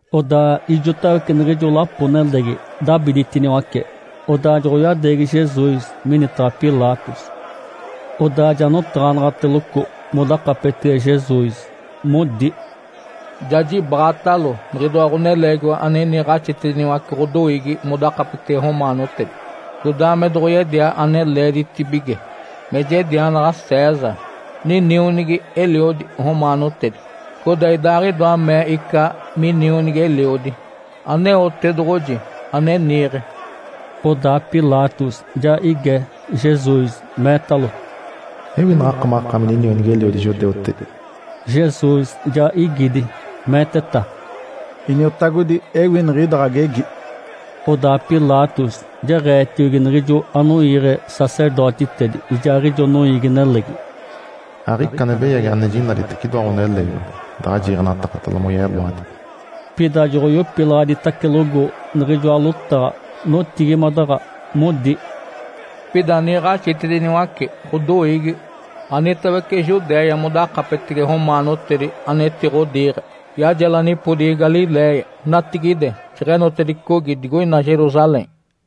Odaa ijotawece niɡ̶ijo lapo-nelegi dabiditiniwace, odaa joɡ̶oyadeegi Jesus minitaɡ̶a Pilatos. Odaa ja notaɡ̶anaɡ̶ateloco modakapetege Jesus, modi, “Ja jibaɡ̶atalo niɡ̶idoa ɡ̶oneleegiwa ane niiɡ̶axitediniwace ɡ̶odoiigi modakapetege romaanotedi, codaa me doɡ̶oyedia ane leeditibige me jedianaɡ̶a César, ninionigi-eliodi romaanotedi. Codaa Idaaɡ̶idoa mee ica minionigi-eliodi, Aneotedoɡ̶oji ane niiɡ̶e.” Odaa Pilatos ja ige Jesus, meetalo, “Ewi naɡ̶akamaɡ̶akaami ninionigi-eliodi judeutedi?” Jesus ja igidi, meeteta, “Iniotagodi, ewi niɡ̶ida ɡ̶agegi.” Odaa Pilatos jeɡ̶eetiogi niɡ̶ijo anoiiɡ̶e sacerdotitedi, ijaaɡ̶ijo noiigi-nelegi, “Aɡ̶ica ane beyagi ane jinaditece idoa ɡ̶oneleegiwa daɡ̶a jiiɡ̶enatakatalo moyeloadi.” Pida joɡ̶oyopilaɡ̶aditacelogo niɡ̶ijoa lotaɡ̶a, notigimadaɡ̶a, modi, “Pida niiɡ̶axitediniwace ɡ̶odoiigi anitawece Judéia modakapetege romaanotedi, anetiɡ̶odiiɡ̶e. Yajela nipodigi Galiléia, natigide jeɡ̶enotedicogi digoina Jerusalém.”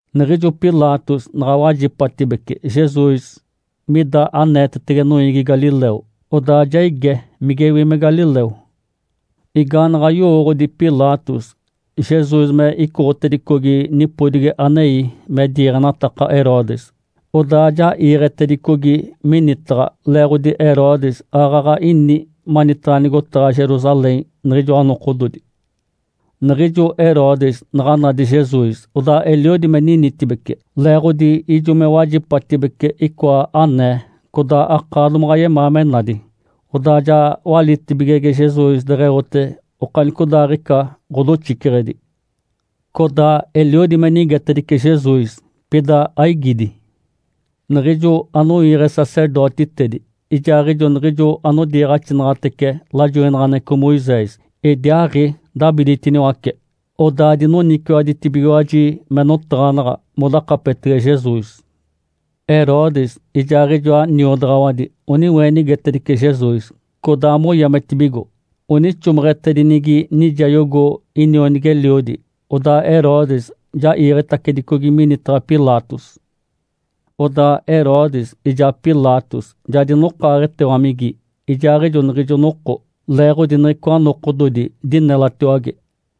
Niɡ̶ijo Pilatos naɡ̶a wajipatibece Jesus mida aneetetege noiigi galileu, odaa ja ige migewi me galileu. Igaanaɡ̶a yowooɡ̶odi Pilatos Jesus me icoɡ̶otedicogi nipodigi anei me diiɡ̶enataka Herodes, odaa ja iiɡ̶etedicogi minitaɡ̶a, leeɡ̶odi Herodes aaɡ̶aɡ̶a ini manitaɡ̶a nigotaɡ̶a Jerusalém niɡ̶ijoa nokododi. Niɡ̶ijo Herodes naɡ̶a nadi Jesus, odaa eliodi me ninitibece, leeɡ̶odi ijo me wajipatibece icoa anee, codaa akaa domaɡ̶a yemaa me nadi. Odaa ja walitibigege Jesus deɡ̶eote okanicodaaɡ̶ica ɡ̶odoxiceɡ̶edi. Codaa eliodi me nigetedice Jesus, pida aigidi. Niɡ̶ijo anoiiɡ̶e sacerdotitedi ijaaɡ̶ijo niɡ̶ijo anodiiɡ̶axinaɡ̶atece lajoinaɡ̶aneɡ̶eco Moisés, idiaaɡ̶i dabiditiniwace. Odaa dinoniciwaɡ̶aditibigiwaji me notaɡ̶anaɡ̶a modakapetege Jesus. Herodes ijaaɡ̶ijoa niodaɡ̶awadi oniweenigitedice Jesus, codaa moyametibigo. Onixomeɡ̶etedinigi nijayogo inionigi-eliodi, odaa Herodes ja iiɡ̶etacedicogi minitaɡ̶a Pilatos. Odaa Herodes ijaa Pilatos ja dinokaaɡ̶etewamigi ijaaɡ̶ijo niɡ̶ijo noko, leeɡ̶odi niɡ̶icoa nokododi dinelatiwage.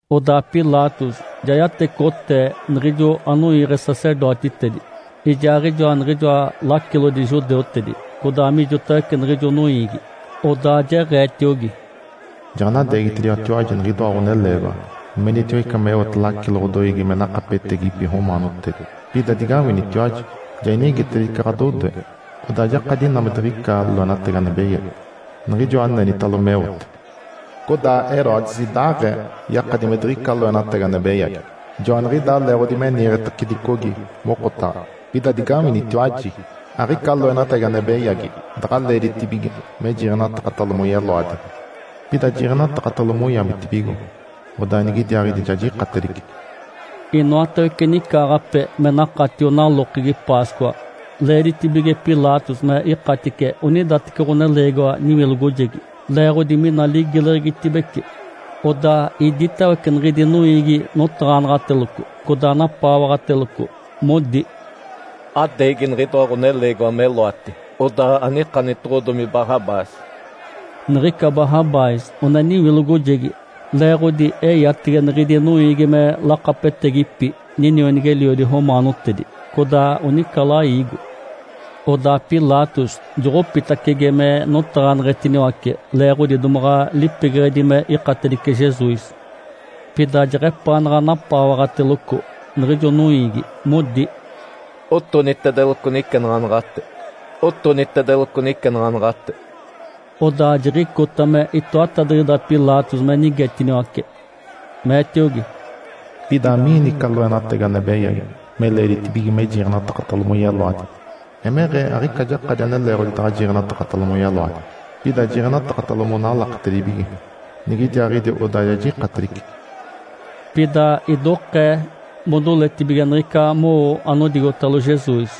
Odaa Pilatos ja yatecoɡ̶otee niɡ̶ijo anoiiɡ̶e sacerdotitedi ijaaɡ̶ijoa niɡ̶ijoa lacilodi judeutedi, codaa mijotawece niɡ̶ijo noiigi. Odaa jeɡ̶eetiogi, “Jaɡ̶anadeegitediwatiwaji niɡ̶idoa ɡ̶oneleegiwa menitiwa ica meote lacilo ɡ̶adoiigi me nakapetegipi romaanotedi. Pida digawinitiwaji, ja inigetedice ɡ̶adodoe, odaa jakadi ina me diɡ̶ica loenatagi ane beyagi, niɡ̶ijoa anenitalo meote. Codaa Herodes idaaɡ̶ee yakadi me diɡ̶ica loenatagi ane beyagi, joaniɡ̶idaa leeɡ̶odi me niiɡ̶etacedicogi mokotaɡ̶a. Pida digawinitiwaji! Aɡ̶ica loenatagi ane beyagi daɡ̶a leeditibige me jiiɡ̶enatakatalo moyeloadi. Pida jiiɡ̶enatakatalo moyametibigo, odaa nigidiaaɡ̶idi ja jikatedice.” Inoatawece nicaaɡ̶ape me nakatio nalokegi Páscoa, leeditibige Pilatos me ikatice onidateci ɡ̶oneleegiwa niwilogojegi, leeɡ̶odi mina ligileɡ̶egitibece. Odaa iditawece niɡ̶idi noiigi notaɡ̶anaɡ̶ateloco, codaa napaawaɡ̶ateloco, modi, “Adeegi niɡ̶idoa ɡ̶oneleegiwa meloati, odaa anikanitoɡ̶odomi Barrabás!” Niɡ̶ica Barrabás one niwilogojegi leeɡ̶odi eyatege niɡ̶idi noiigi me lakapetegipi ninionigi-eliodi romaanotedi, codaa onica laigo. Odaa Pilatos joɡ̶opitacege me notaɡ̶aneɡ̶etiniwace, leeɡ̶odi domaɡ̶a lipegeɡ̶edi me ikatedice Jesus. Pida jeɡ̶epaanaɡ̶a napaawaɡ̶ateloco niɡ̶ijo noiigi, modi, “Otonitedeloco nicenaɡ̶anaɡ̶ate! Otonitedeloco nicenaɡ̶anaɡ̶ate!” Odaa jiɡ̶icota me itoatadiɡ̶ida Pilatos me nigetiniwace, meetiogi, “Pida amiini ica loenatagi ane beyagi me leeditibige me jiiɡ̶enatakatalo moyeloadi? Emeɡ̶ee aɡ̶ica jakadi ane leeɡ̶odi daɡ̶a jiiɡ̶enatakatalo moyeloadi. Pida jiiɡ̶enatakatalo monalaketedibige. Nigidiaaɡ̶idi odaa ja jikatedice.” Pida idokee modoletibige niɡ̶ica mowo anodigotalo Jesus,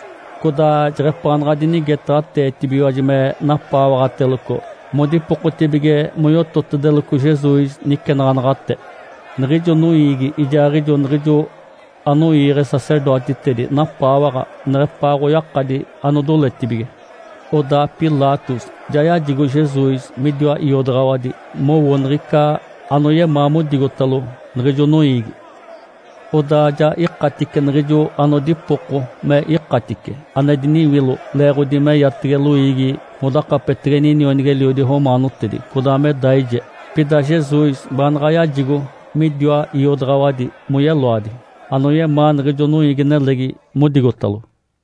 codaa jeɡ̶epaanaɡ̶a dinigetaɡ̶ateetibigiwaji me napaawaɡ̶ateloco, modipokotibige moyototedeloco Jesus nicenaɡ̶anaɡ̶ate. Niɡ̶ijo noiigi ijaaɡ̶ijo niɡ̶ijo anoiiɡ̶e sacerdotitedi napaawaɡ̶a neɡ̶epaa oyakadi anodoletibige. Odaa Pilatos ja yajigo Jesus midiwa iodaɡ̶awadi mowo niɡ̶ica anoyemaa modigotalo niɡ̶ijo noiigi. Odaa ja ikatice niɡ̶ijo anodipoko me ikatice, ane diniwilo leeɡ̶odi meyatege loiigi modakapetege ninionigi-eliodi romaanotedi codaa me daije. Pida Jesus baanaɡ̶a yajigo midiwa iodaɡ̶awadi moyeloadi, anoyemaa niɡ̶ijo noiigi-nelegi modigotalo.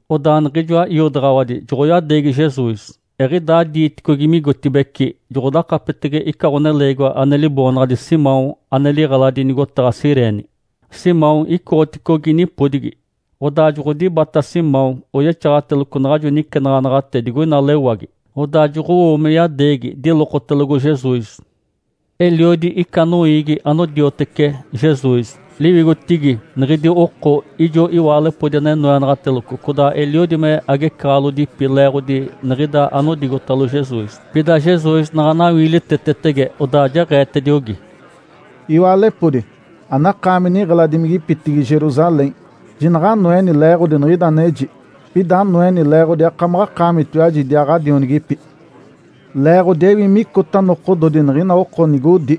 Odaa niɡ̶ijoa iodaɡ̶awadi joɡ̶oyadeegi Jesus. Eɡ̶idaa diiticogi migotibeci, joɡ̶odakapetege ica ɡ̶oneleegiwa ane liboonaɡ̶adi Simão ane liɡ̶eladi nigotaɡ̶a Cirene. Simão icoɡ̶oticogi nipodigi. Odaa joɡ̶odibata Simão, oyexaɡ̶ateloco naɡ̶ajo nicenaɡ̶anaɡ̶ate digoina lewagi, odaa joɡ̶owo me yadeegi dilokotelogo Jesus. Eliodi ica noiigi anodiotece Jesus. Liwigotigi niɡ̶idi oko ijo iwaalepodi ane noenaɡ̶ateloco, codaa eliodi me agecaɡ̶alodipi leeɡ̶odi niɡ̶ida anodigotalo Jesus. Pida Jesus naɡ̶a nawiilitetetege, odaa jeɡ̶eetediogi, “Iwaalepodi, anakaami niɡ̶eladimigipitigi Jerusalém, jinaɡ̶anoeni leeɡ̶odi niɡ̶ida aneji, pida anoeni leeɡ̶odi akamaɡ̶akaamitiwaji idiaa ɡ̶adionigipi! Leeɡ̶odi ewi micota nokododi niɡ̶ina oko nigodi,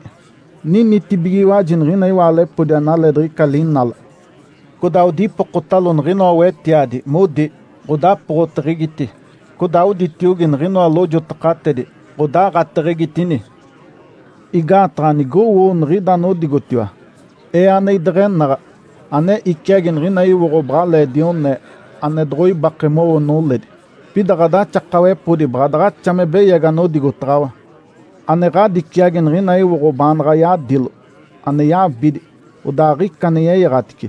‘Ninitibigiwaji niɡ̶ina iwaalepodi analee diɡ̶ica linala!’ Codaa odipokotalo niɡ̶inoa wetiadi, modi, ‘Ǥodapoɡ̶oteɡ̶egiti!’ Codaa oditiogi niɡ̶inoa lojotakatedi, ‘Ǥodaaɡ̶ateɡ̶egitini!’ Igaataɡ̶a nigowo niɡ̶ida anodigotiwa, Ee ane ideɡ̶enaɡ̶a, ane iciagi niɡ̶ina iwoɡ̶o baɡ̶alee dione (ane doɡ̶oibake mowo noledi), pida ɡ̶adaxakawepodi baɡ̶a daɡ̶axa me beyagi anodigotaɡ̶awa, ane ɡ̶adiciagi niɡ̶ina iwoɡ̶o baanaɡ̶a yadilo (ane yabidi, odaa aɡ̶ica ane yeyaɡ̶atice).”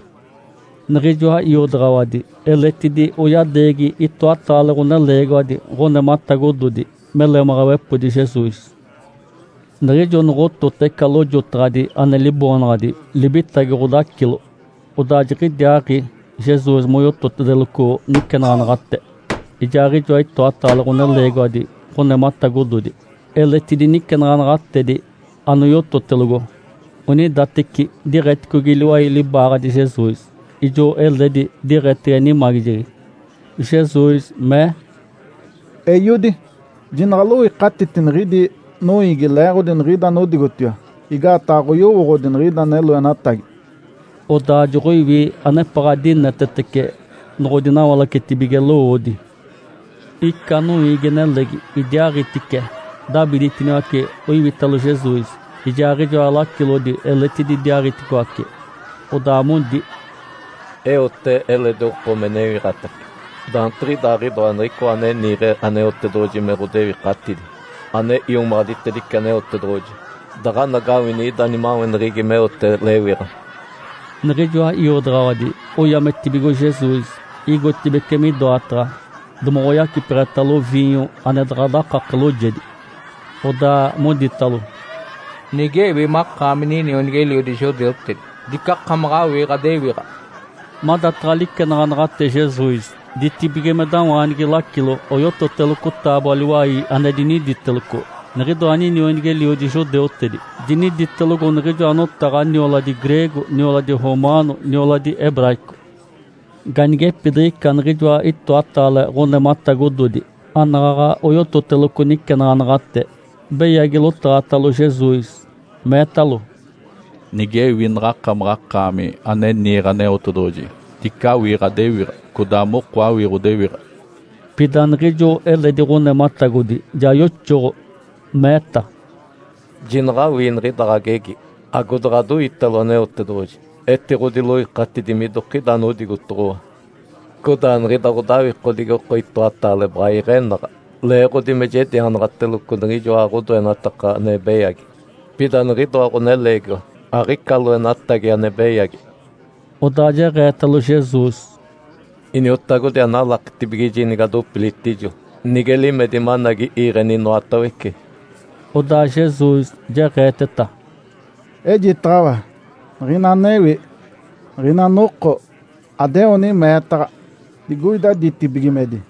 Niɡ̶ijoa iodaɡ̶awadi eletidi oyadeegi itoataale ɡ̶oneleegiwadi ɡ̶onematagododi me lemaɡ̶awepodi Jesus. Niɡ̶ijo noɡ̶otota ica lojotaɡ̶adi ane liboonaɡ̶adi “Libitagi Ǥodacilo”, odaa jiɡ̶idiaaɡ̶i Jesus moyototedeloco nicenaɡ̶anaɡ̶ate. Ijaaɡ̶ijoa itoataale ɡ̶oneleegiwadi ɡ̶onematagododi eletidi nicenaɡ̶anaɡ̶atedi anoyototelogo, onidateci diɡ̶eticogi liwai libaaɡ̶adi Jesus, ijo eledi diɡ̶etege nimagijegi. Jesus mee, “Eiodi, jinaɡ̶aloikatiti niɡ̶idi noiigi leeɡ̶odi niɡ̶ida anodigotiwa. Igaataɡ̶a aɡ̶oyowooɡ̶odi niɡ̶ida ane loenatagi.” Odaa joɡ̶oiwi anepaɡ̶a dinetetece noɡ̶odinawalacetibige lowoodi. Ica noiigi-nelegi idiaaɡ̶itice dabiditiniwace oiwitalo Jesus, ijaaɡ̶ijoa lacilodi eletidi idiaaɡ̶iticoaci, odaa modi, “Eote eledi oko me newiɡ̶atace. Daantiɡ̶idaaɡ̶idoa Niɡ̶icoa ane niiɡ̶e Aneotedoɡ̶oji me ɡ̶odewikatidi, ane iomaɡ̶aditedice Aneotedoɡ̶oji, daɡ̶anagawini ida nimaweneɡ̶egi meote lewiɡ̶a.” Niɡ̶ijoa iodaɡ̶awadi oyametibigo Jesus. Igotibeci midoataɡ̶a domoɡ̶oyacipeɡ̶etalo viinyo ane daɡ̶a dakake loojedi. Odaa moditalo, “Nigewi makaami ninionigi-eliodi judeutedi, dicakamaɡ̶a awii ɡ̶adewiɡ̶a!” Madataɡ̶a licenaɡ̶anaɡ̶ate Jesus ditibigimedawaanigi lacilo, oyototeloco taaboa-liwai ane diniditeloco, “NIǤIDOA NINIONIGI-ELIODI JUDEUTEDI.” Diniditelogo niɡ̶ijoa notaɡ̶a nioladi greego, nioladi romaano, nioladi hebraico. Ganigepidiɡ̶ica niɡ̶ijoa itoataale ɡ̶onematagododi anaɡ̶aɡ̶a oyototeloco nicenaɡ̶anaɡ̶ate, beyagi lotaɡ̶atalo Jesus, meetalo, “Nigewi naɡ̶akamaɡ̶akaami ane niiɡ̶e Aneotedoɡ̶oji, dice awii ɡ̶adewiɡ̶a, codaa moko awii ɡ̶odewiɡ̶a!” Pida niɡ̶ijo eledi ɡ̶onematagodi ja yoxoɡ̶o, meeta, “Jinaɡ̶awii niɡ̶ida ɡ̶agegi, agodaɡ̶adoiitalo Aneotedoɡ̶oji? Etiɡ̶odiloikatidi midokida anodigotoɡ̶owa. Codaa niɡ̶ida ɡ̶odawikodigi oko itoataale baɡ̶a iɡ̶enaɡ̶a, leeɡ̶odi me jedianaɡ̶ateloco niɡ̶ijoa ɡ̶odoenataka ane beyagi. Pida niɡ̶idoa ɡ̶oneleegiwa, aɡ̶ica loenatagi ane beyagi.” Odaa jeɡ̶eetalo Jesus, “Iniotagodi, analakitibigiji, nigadopilitijo, nige limedi managi iiɡ̶eni inoatawece.” Odaa Jesus jeɡ̶eeteta, “Ejitaɡ̶awa niɡ̶ina anewi, niɡ̶ina noko adeoni meetaɡ̶a digoida ditibigimedi.”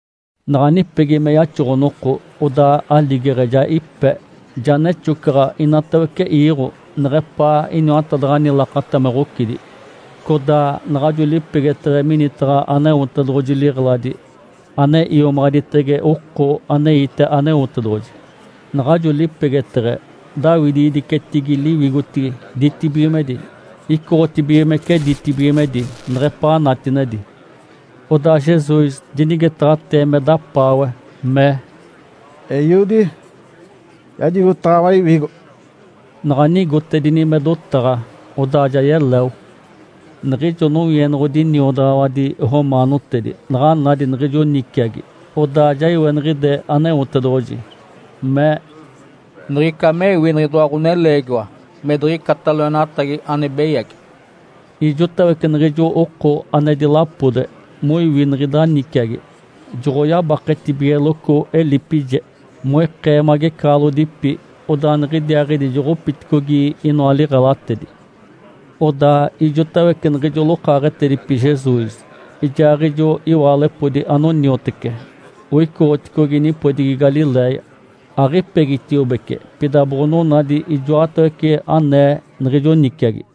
Naɡ̶a nipegi me yaxoɡ̶o-noko, odaa aligeɡ̶e ja ipe, ja nexocaɡ̶a inatawece iiɡ̶o, neɡ̶epaa iniwatadaɡ̶ani lakata me ɡ̶ocidi. Codaa naɡ̶ajo lipegeteɡ̶e minitaɡ̶a Aneotedoɡ̶oji liɡ̶eladi, ane iomaɡ̶aditege oko aneite Aneotedoɡ̶oji, naɡ̶ajo lipegeteɡ̶e daawidigidicetigi liwigotigi ditibigimedi, icoɡ̶otibigimece ditibigimedi neɡ̶epaa natinedi. Odaa Jesus dinigetaɡ̶atee me dapaawe, mee, “Eiodi, jajigotaɡ̶awa iwigo!” Naɡ̶a nigotedini me dotaɡ̶a, odaa ja yeleo. Niɡ̶ijo nowienoɡ̶odi niodaɡ̶awadi romaanotedi naɡ̶a nadi niɡ̶ijo niciagi, odaa ja iweniɡ̶ide Aneotedoɡ̶oji, mee, “Niɡ̶ica mewi niɡ̶idoa ɡ̶oneleegiwa me diɡ̶icata loenatagi ane beyagi!” Ijotawece niɡ̶ijo oko ane dilapode moiwi niɡ̶ida niciagi, joɡ̶oyabaketibigeloco elipije, moikee magecaɡ̶alodipi, odaa niɡ̶idiaaɡ̶idi joɡ̶opiticogi inoa liɡ̶elatedi. Odaa ijotawece niɡ̶ijo lokaaɡ̶etedipi Jesus, ijaaɡ̶ijo iwaalepodi anoniotece, oicoɡ̶oticogi nipodigi Galiléia, aɡ̶ipegitiobece, pida boɡ̶onadi ijoatawece anee niɡ̶ijo niciagi.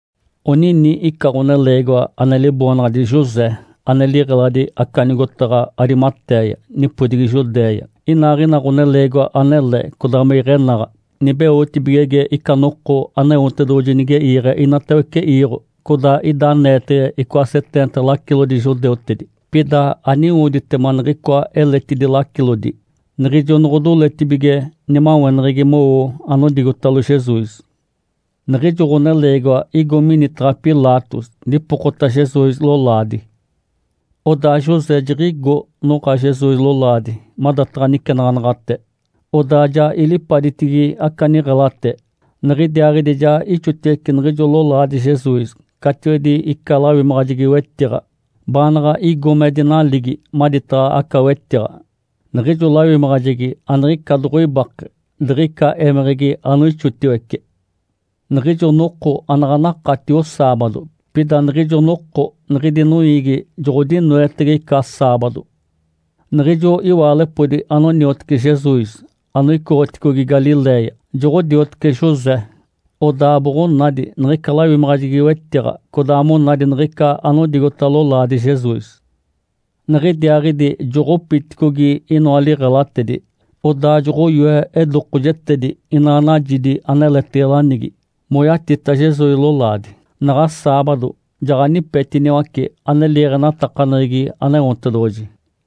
Onini ica ɡ̶oneleegiwa ane liboonaɡ̶adi José, ane liɡ̶eladi aca nigotaɡ̶a Arimatéia, nipodigi Judéia. Inaaɡ̶ina ɡ̶oneleegiwa anele, codaa me iɡ̶enaɡ̶a, nibeotibigege ica noko Aneotedoɡ̶oji nige iiɡ̶e inatawece iiɡ̶o. Codaa ida aneetege icoa seteenta lacilodi judeutedi. Pida aniwoditema niɡ̶icoa eletidi lacilodi, niɡ̶ijo noɡ̶odoletibige nimaweneɡ̶egi mowo anodigotalo Jesus. Niɡ̶ijo ɡ̶oneleegiwa igo minitaɡ̶a Pilatos dipokota Jesus lolaadi. Odaa José jiɡ̶igo noɡ̶a Jesus lolaadi madataɡ̶a nicenaɡ̶anaɡ̶ate, odaa ja ilipaditigi aca niɡ̶elate. Niɡ̶idiaaɡ̶idi ja ixotiwece niɡ̶ijo lolaadi Jesus catiwedi ica lawimaɡ̶ajegi-wetiɡ̶a, baanaɡ̶a igo me dinaligi maditaɡ̶a aca wetiɡ̶a. Niɡ̶ijo lawimaɡ̶ajegi aniɡ̶ica doɡ̶oibake diɡ̶ica émeɡ̶egi anoixotiwece. Niɡ̶ijo noko anaɡ̶a nakatio saabado, pida niɡ̶ijo noko niɡ̶idi noiigi joɡ̶odinoetege ica saabado. Niɡ̶ijo iwaalepodi anoniotece Jesus anoicoɡ̶oticogi Galiléia, joɡ̶odioteci José. Odaa boɡ̶onadi niɡ̶ica lawimaɡ̶ajegi-wetiɡ̶a, codaa monadi niɡ̶ica anodigota lolaadi Jesus. Niɡ̶idiaaɡ̶idi joɡ̶opiticogi inoa liɡ̶elatedi, odaa joɡ̶oyoe edokojetedi, ina najidi aneletege lanigi, moyatita Jesus lolaadi. Naɡ̶a saabado jaɡ̶anipetiniwace, ane liiɡ̶enatakaneɡ̶egi Aneotedoɡ̶oji.